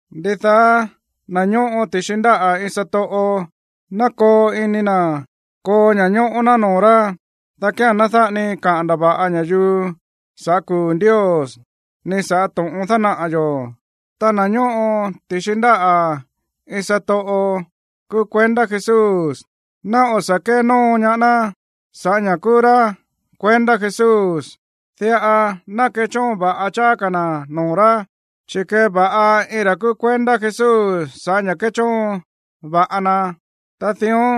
Ndidaá na̱ ñóꞌo ti̱xi ndáꞌa̱ iin satoꞌo, ná koo ini na̱ koo ña̱ñóꞌó ná noo̱ rá, dá kía̱n ná dáꞌa ni kaꞌa̱n ndava̱ꞌa ña̱yuu sa̱ꞌá kuu̱ Ndios, ni sa̱ꞌá to̱ꞌon dánaꞌa̱ yo̱. Ta na̱ ñóꞌo ti̱xi ndáꞌa̱ iin satoꞌo kúú kuendá Jesús, ná o̱ sa̱ kénóo ñaá ná sa̱ꞌá ña̱ kúú rá kuendá Jesús. Diꞌa ná kechóon va̱ꞌa cháá ka̱ na̱ noo̱ rá, chi̱ kéva̱ꞌa iin ra̱ kúú kuendá Jesús sa̱ꞌá ña̱ kéchóon va̱ꞌa na. Ta dión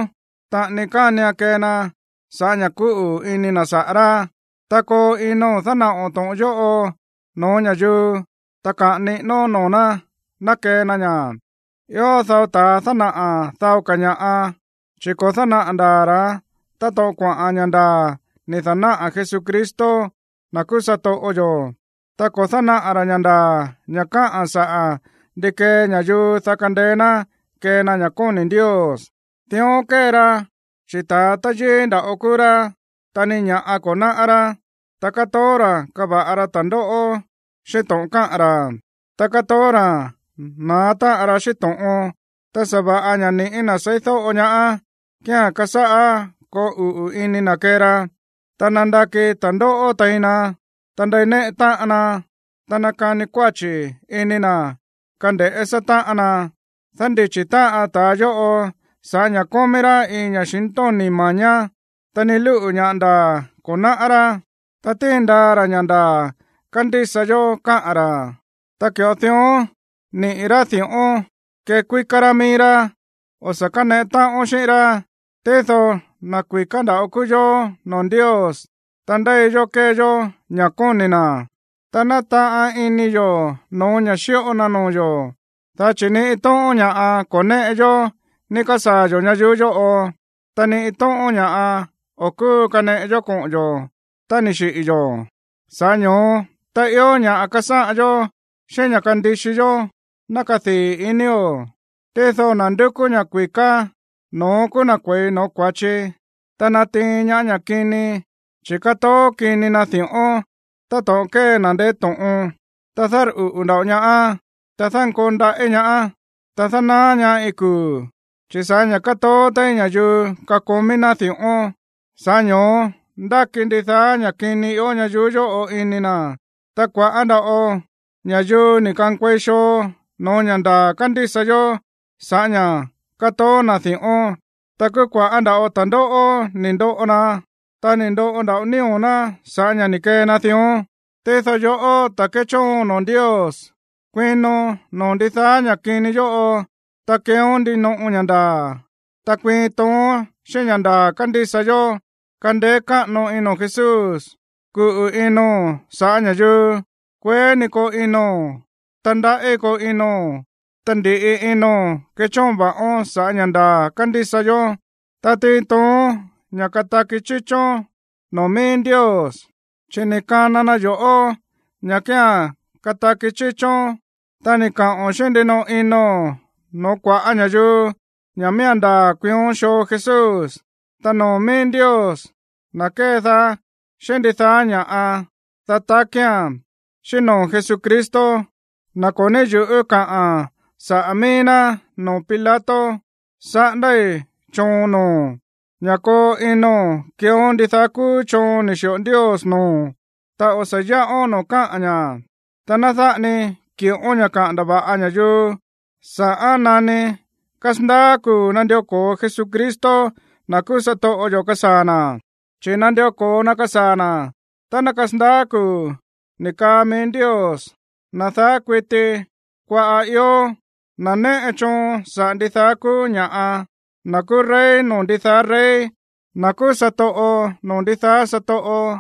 taꞌani kánian kee na sa̱ꞌá ña̱ kúꞌu̱ ini na̱ saꞌa̱ rá. Ta koo ino̱n dánaꞌo̱n to̱ꞌon yóꞌo no̱ó ña̱yuu, ta kaꞌa̱n niꞌínón noo̱ ná ná kee na ña̱. Ió dao ta̱a dánaꞌa̱ dao ka̱ ña̱ꞌa, chi̱ ko̱ dánaꞌa̱ ndaa̱ ra̱ táto̱ꞌon kuaꞌa̱n ña̱ ndaa̱ ni̱ da̱náꞌa̱ Jesucristo, na̱ kúú satoꞌo yo̱. Ta ko̱ dánaꞌa̱ ra̱ ña̱ ndaa̱, ña̱ káꞌa̱n saꞌa̱ ndi kee ña̱yuu, dá kandeé ná kee na ña̱ kóni̱ Ndios. Dión kée ra, chi̱ ta̱a táyíí nda̱ꞌo kúú rá, ta ni ña̱ꞌa ko̱ náꞌá rá, ta kátoó ra̱ kava̱ꞌa ra ta̱ndóꞌó xíꞌín to̱ꞌon káꞌa̱n ra̱, ta kátoó ra̱ na̱á táꞌan ra xíꞌín to̱ꞌon. Ta sa̱va̱ꞌa ña̱ ni̱ꞌí na̱ seídóꞌo ñaá kíán kásáꞌá koo uꞌu̱ ini na̱ kée ra, ta nándaki ta̱ndóꞌó tein na, ta ndéineꞌe táꞌan na, ta nákani kuáchi̱ ini na̱ kande̱ꞌé sátáꞌan ná. Dándichi̱ táꞌan ta̱a yóꞌo sa̱ꞌá ña̱ kómí rá iin ña̱xintóni̱ ma̱ñá, ta ni lúꞌu̱ ña̱ ndaa̱ ko̱ náꞌá rá. Ta tíin ndaa ra̱ ña̱ ndaa̱ kándísa yó káꞌa̱n ra̱, ta ki̱ꞌo dión níꞌi̱ rá di̱ꞌón kekuíká rá mií rá. O̱ sa̱ káneꞌe táꞌón xíꞌín rá. Tído na̱ kui̱ká nda̱ꞌo kúú yó noo̱ Ndios tá ndéi yó kée yó ña̱ kóni̱ na̱, ta nátaꞌan ini yo̱ no̱ó ña̱ xíꞌo na noo̱ yo̱. Dá chi̱ ni iin tóꞌón ña̱ꞌa ko̱ néꞌe yó ni̱ ka̱sáa̱ yo̱ ñayuú yóꞌo, ta ni iin tóꞌón ña̱ꞌa o̱ kúu kaneꞌe yó koꞌo̱ tá ni̱ xiꞌi̱ yo̱. Sa̱ꞌá ño̱ó tá ió ña̱ꞌa kasáꞌan yó xíꞌín ña̱ꞌa kandixi yó, ná kadii̱ inio̱. Tído na̱ ndúkú ña̱ kui̱ká, no̱ón kúú na̱ kue̱i noo̱ kua̱chi, ta natiin ñaá ña̱ kini, chi̱ kátoó kini na di̱ꞌón táto̱ꞌon kée na̱ ndeé to̱ꞌon, ta dárꞌuꞌu̱ nda̱ꞌo ñaá, ta dánkoo ndaꞌí ñaá, ta dánaá ñaá iin kuu̱. Chi̱ sa̱ꞌá ña̱ kátoó téí ña̱yuu kakomí ná di̱ꞌón, sa̱ꞌá ño̱ó ndáki ndidaá ña̱ kini ió ñayuú yóꞌo ini na̱. Ta kua̱ꞌá nda̱ꞌo ña̱yuu ni̱ ka̱nkuei xoo no̱ó ña̱ ndaa̱ kándísa yó sa̱ꞌá ña̱ kátoó na̱ di̱ꞌón. Ta kúú kua̱ꞌá nda̱ꞌo ta̱ndóꞌó ni̱ ndoꞌo na, ta ni̱ ndoꞌo nda̱ꞌo nío̱ ná sa̱ꞌá ña̱ ni̱ kee na dión. Tído yoꞌó, ta̱ kéchóon noo̱ Ndios, kuino noo̱ ndidaá ña̱ kini yóꞌo, ta keeón ndinoꞌo ña̱ ndaa̱, ta kuiin toon xíꞌín ña̱ ndaa̱ kándísa yó, kandeé káꞌano ino̱n Jesús, kuꞌu̱ ino̱n sa̱ꞌá ña̱yuu, kueé ní koo ino̱n, ta ndaꞌí koo ino̱n. Ta ndi̱ꞌi ino̱n kechóon va̱ꞌón sa̱ꞌá ña̱ ndaa̱ kándísa yó, ta tiin toon ña̱ kataki chíchón noo̱ mií Ndios, chi̱ ni̱ kana na yo̱ꞌó ña̱ kía̱n kataki chíchón tá ni̱ kaꞌo̱n xíꞌín ndinoꞌo ino̱n no̱ó kua̱ꞌá ña̱yuu ña̱ miía̱n ndaa̱ kuiión xoo Jesús. Ta noo̱ mií Ndios, na̱ kédaá xíꞌín ndidaá ña̱ꞌa, dá takía̱n, xíꞌín noo̱ Jesucristo, na̱ ko̱ ní yu̱ꞌú kaꞌa̱n saꞌa̱ mií ná noo̱ Pilato, saꞌándái̱ choon noo̱o̱n ña̱ koo ino̱n keeón ndidaá kúú choon ni̱ xi̱ꞌo Ndios noo̱o̱n, ta o̱ sa̱ yáꞌón noo̱ káꞌa̱n ña̱, ta ná dáꞌa ni ki̱ꞌón ña̱ kaꞌa̱n ndava̱ꞌa ña̱yuu sa̱ꞌán nani kasandaá kuu̱ nandió ko̱o Jesucristo, na̱ kúú satoꞌo yo̱, kasaa̱ na̱. Chi̱ nandió ko̱o na kasaa̱ na̱ tá ná kasandaá kuu̱ ni̱ kaa mií Ndios, na̱ daá kuití kuaꞌa̱ ió, na̱ néꞌe choon saꞌa̱ ndidaá kúú ña̱ꞌa, na̱ kúú rey noo̱ ndidaá rey, na̱ kúú satoꞌo noo̱ ndidaá satoꞌo.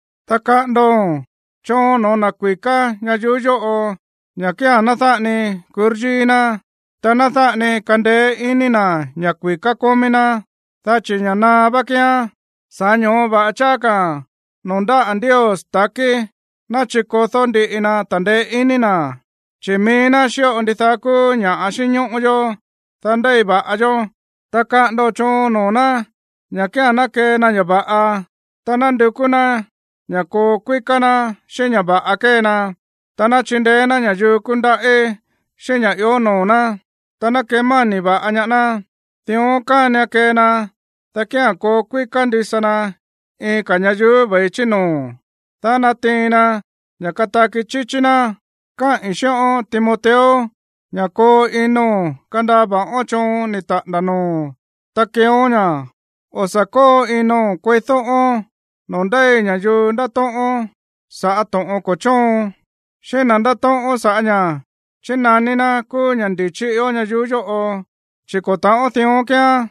Ta kaꞌa̱ndo̱n choon no̱ó na̱ kui̱ká ñayuú yóꞌo, ña̱ kía̱n ná dáꞌa ni kuryíí ná, ta ná dáꞌa ni kandeé iní na̱ ña̱ kui̱ká kómí ná, dá chi̱ ña̱ naá vá kíán. Sa̱ꞌá ño̱ó va̱ꞌa cháá ka̱ noo̱ ndáꞌa̱ Ndios ta̱kí ná chikodó ndíꞌi na ta̱ndeé iní na̱, chi̱ mií ná xíꞌo ndidaá kúú ña̱ꞌa xínñóꞌó yó, dá ndéi va̱ꞌa yó. Ta kaꞌa̱ndo̱n choon noo̱ ná ña̱ kía̱n ná kee na ña̱ va̱ꞌa, ta ná ndukú ná ña̱ koo kuíká ná xíꞌín ña̱ va̱ꞌa kée na. Ta ná chindeé ná ña̱yuu kúndaꞌí xíꞌín ña̱ ió noo̱ ná, ta ná kemáni̱ va̱ꞌa ñaá ná. Dión kánian kee na, dá kía̱n koo kuíká ndisa na iin ka̱ ñayuú ve̱i chí noo̱, dá natiin na ña̱ kataki chíchí ná. Káꞌi̱n xíꞌón, Timoteo, ña̱ koo ino̱n kandaa va̱ꞌón choon ni̱ taꞌa̱nda̱ noo̱o̱n, ta keeón ña̱. O̱ sa̱ kóo ino̱n kueídóꞌón no̱ó ndéi ña̱yuu ndátóꞌón sa̱ꞌá to̱ꞌon ko̱ chóon, xíꞌín na̱ ndátóꞌón sa̱ꞌá ña̱ chínaní ná kúú ña̱ ndi̱chí ió ñayuú yóꞌo, chi̱ ko̱ ta̱ꞌón dión kíán.